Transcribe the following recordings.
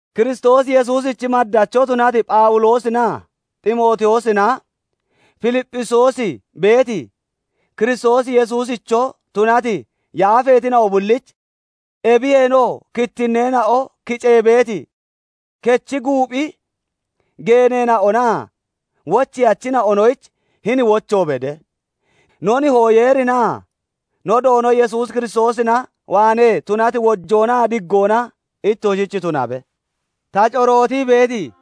Kiristoos Yesuusichi maddacho tunati Phawuloosinaa Ximootiyoosina Filipphisiyoos beeti, Kiristoos Yesuusicho tunati yaafeetina'o bullich; ebiyeenoo kittinneena'o kicee beeti kechi guuphi geeneena'onaa wocheyachina'onoyich hini wocho bede; no Nihoo Yeerinaa no Doono Yesuus Kiristoosina waanee tunati wojoonaa diggoona ittoshich tunabe. Ta corootii beeti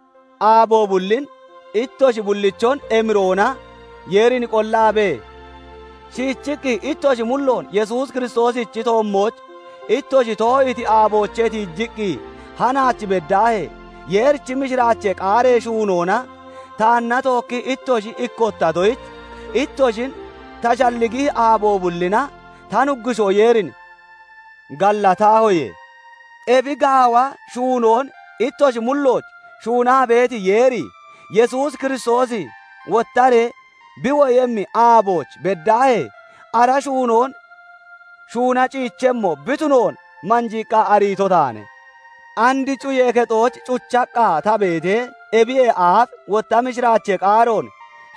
aabo bullin ittoshi bullichon emiroona Yeerin qollaabee, shiichiqqi ittoshi mulloon Yesuus Kiristoosichi toommooch ittoshi too'iiti aaboochee tiijiqqi hanaach beddaahee, Yeerichi mishiraachee qaaree shuunoona taanna tookkii ittoshi ikkottatoyich, ittoshin ta shalligihi aabo bullina ta Nuggushoo Yeerin gallatahoye. Ebi gaawa shuunoon ittoshi mullooch shuunaa beeti Yeeri, Yesuus Kiristoosi wottaree bi woyemmi aabooch beddaahee ara shuunoon shuuna ciichemmo bi tunoon manjiiqqa ariito taane. And cuyee kexooch cuchaqqa ta beetee, ebiyee aaf wotta mishiraachee qaaroon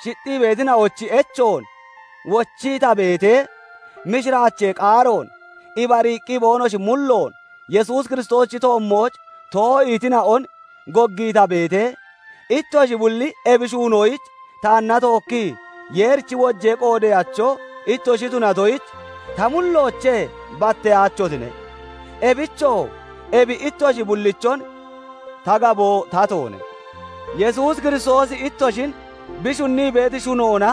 shixxii beetina'ochi echoon wochii ta beetee, mishiraachee qaaroon ibariiqqi boonoshi mulloon Yesuus Kiristoosichi toommooch too'iitina'on goggii ta beetee, ittoshi bulli ebi shuunoyich taanna tookkii Yeerichi wojee qoodeyacho ittoshi tunatoyich ta mulloochee batteyaachotine. Ebichoo ebi ittoshi bullichon ta gaboo tatoone. Yesuus Kiristoosi ittoshin bi shunnii beeti shunoona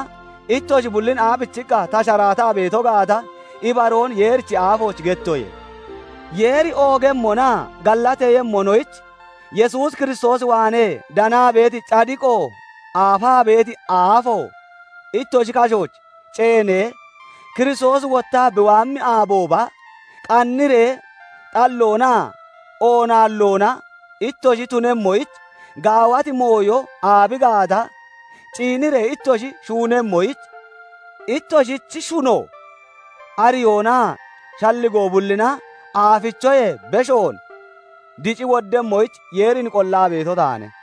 ittoshi bullin aabichiqqa ta sharaataa beeto gaata ibaroon Yeerichi aafooch gettoye. Yeeri oogemmonaa gallateeyemmonoyich Yesuus Kiristoos waanee danaa beeti cadiqo aafaa beeti aafo ittoshi kashooch ceenee, Kiristoosi wottaa bi waammi aabooba qanniree xalloonaa oonaalloona ittoshi tunemmoyich, gaawati mooyo aabi gaata ciiniree ittoshi shunnemmoyich, ittoshichi shuno, ariyoonaa shalligoo bullina aafichoyee beshoon dici woddemmoyich Yeerin qollaa beeto taane.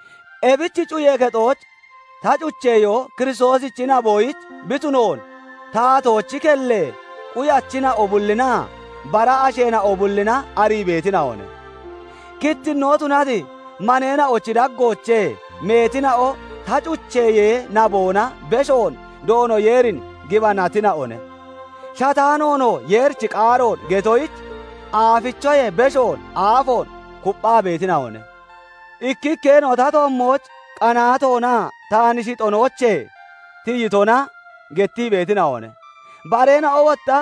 Ebich cuyee kexooch ta cucheyo Kiristoosichi naboyich bi tunoon taatoochi kellee quyachina'o bullinaa bara asheena'o bullina arii beetina'one. Kittinnoo tunati maneena'ochi daggoochee meetina'o ta cucheyee naboona beshoon Doono Yeerin gibanatina'one; shataanoonoo Yeerichi qaaroon getoyich aafichoyee beshoon aafoon kupphaa beetina'one. Ikkikkeena'o ta toommooch qanaatoonaa taan shixonoochee tiyitona gettii beetina'one; bareena'oo wotta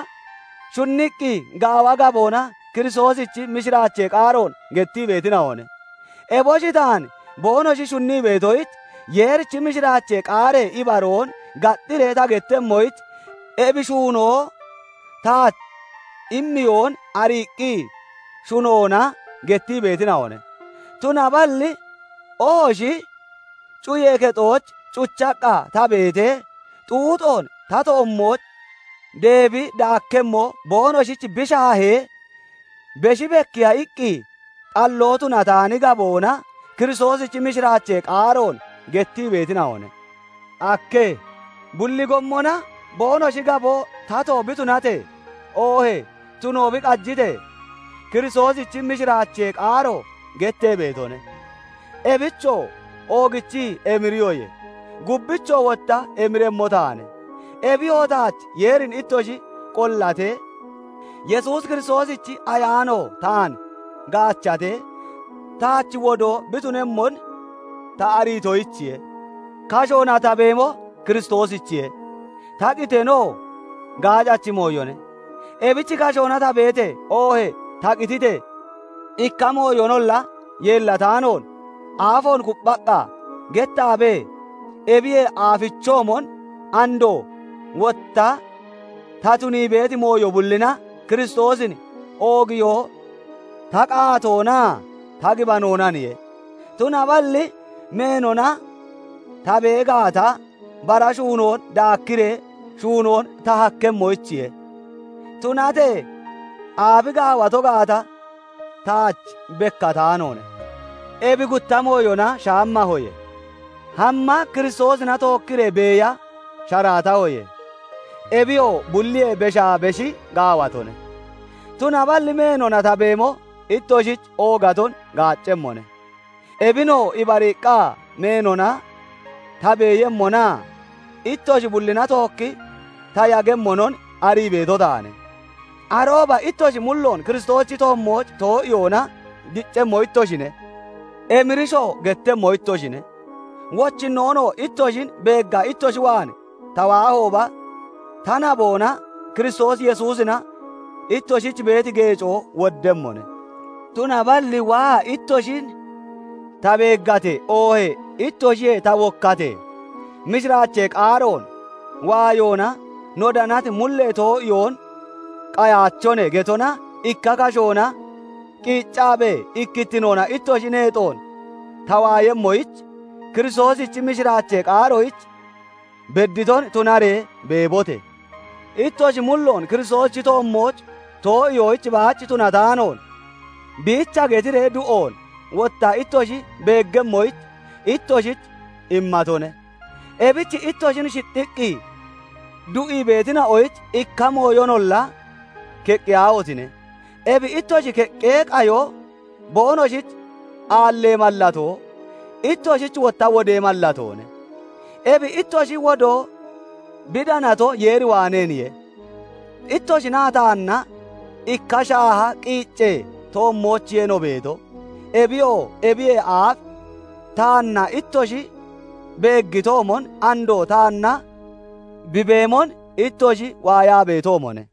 shunniqqi gaawa gaboona Kiristoosichi mishiraachee qaaroon gettii beetina'one. Eboshi taan boonoshi shunnii beetoyich, Yeerichi mishiraachee qaaree ibaroon gaxxiree ta gettemmoyich ebi shuunoo taach immeyoon ariiqqi shunoona gettii beetina'one. Tunaballi ohoshi cuyee kexooch cuchaqqa ta beetee xuuxoon ta toommooch deebi daakkemmo boonoshich bi shaahee, beshi bekkiya iqqi xalloo tunataani gaboona Kiristoosichi mishiraachee qaaroon gettii beetina'one. Ake! Bulli gommona boonoshi gaboo tato bi tunatee, oohee tuno bi qajitee, Kiristoosichi mishiraachee qaaro gettee beetone. Ebichoo oogichii emiriyoye; gubbichoo wotta emiremmo taane. Ebiyoo taach Yeerin ittoshi qollatee, Yesuus Kiristoosichi Ayaanoo taan gaachatee, taach wodoo bi tunemmon ta ariitoyichiye. Kashoona ta beemo Kiristoosichiye; ta qiteenoo gaacachi mooyone. Ebich kashoona ta beetee oohee ta qititee, ikka mooyonolla yeellataanoon aafoon kupphaqqa gettaabee ebiyee aafichoomon andoo wotta ta tunii beeti mooyo bullina Kiristoosin oogiyo ta qaatoonaa ta gibanoonaniye. Tunaballi meenona ta bee gaata, bara shuunoon daakkiree shuunoon ta hakkemmoyichiye; tunatee aabi gaawato gaata taach bekkataanoone. Ebi gutta mooyona shaammahoye; hamma Kiristoosina tookkiree beeya sharaatahoye; ebiyoo bulliyee beshaa beshi gaawatone. Tunaballi meenona ta beemo ittoshich oogaton gaaccemmone. Ebinoo ibariiqqa meenona ta beeyemmonaa ittoshi bullina tookki ta yagemmonon arii beeto taane. Arooba ittoshi mulloon Kiristoosichi toommooch too'iyoona diccemmo ittoshine; emirishoo gettemmo ittoshine. Wochinnoonoo ittoshin beegga ittoshi waan ta waahooba ta naboona Kiristoos Yesuusina ittoshich beeti geecoo woddemmone. Tunaballi waa ittoshin ta beeggatee oohee ittoshiyee ta wokkatee, "Mishiraachee qaaroon waayoona no danati mullee too'iyoon qayaachone" getona ikka kashoona qiiccaabee ikkittinoona ittoshi neexoon ta waayemmoyich, Kiristoosichi mishiraachee qaaroyich bedditon tunaree beebote! Ittoshi mulloon Kiristoosichi toommooch too'iyoyich baach tunataanoon, biicha getiree du'oon wotta ittoshi beeggemmoyich ittoshich immatone; ebich ittoshin shixxiqqi du'ii beetina'oyich ikka mooyonolla keqqiyaahotine! Ebi ittoshi keqqee qayo boonoshich aallee mallatoo, ittoshich wotta wodee mallatoone. Ebi ittoshi wodoo bi danato Yeeri waaneeniye. Ittoshinaa taanna ikka shaaha qiiccee toommoochiye no beeto. Ebiyoo ebiyee aaf taanna ittoshi beeggitoomon, andoo taanna bi beemon ittoshi waayaa beetoomone.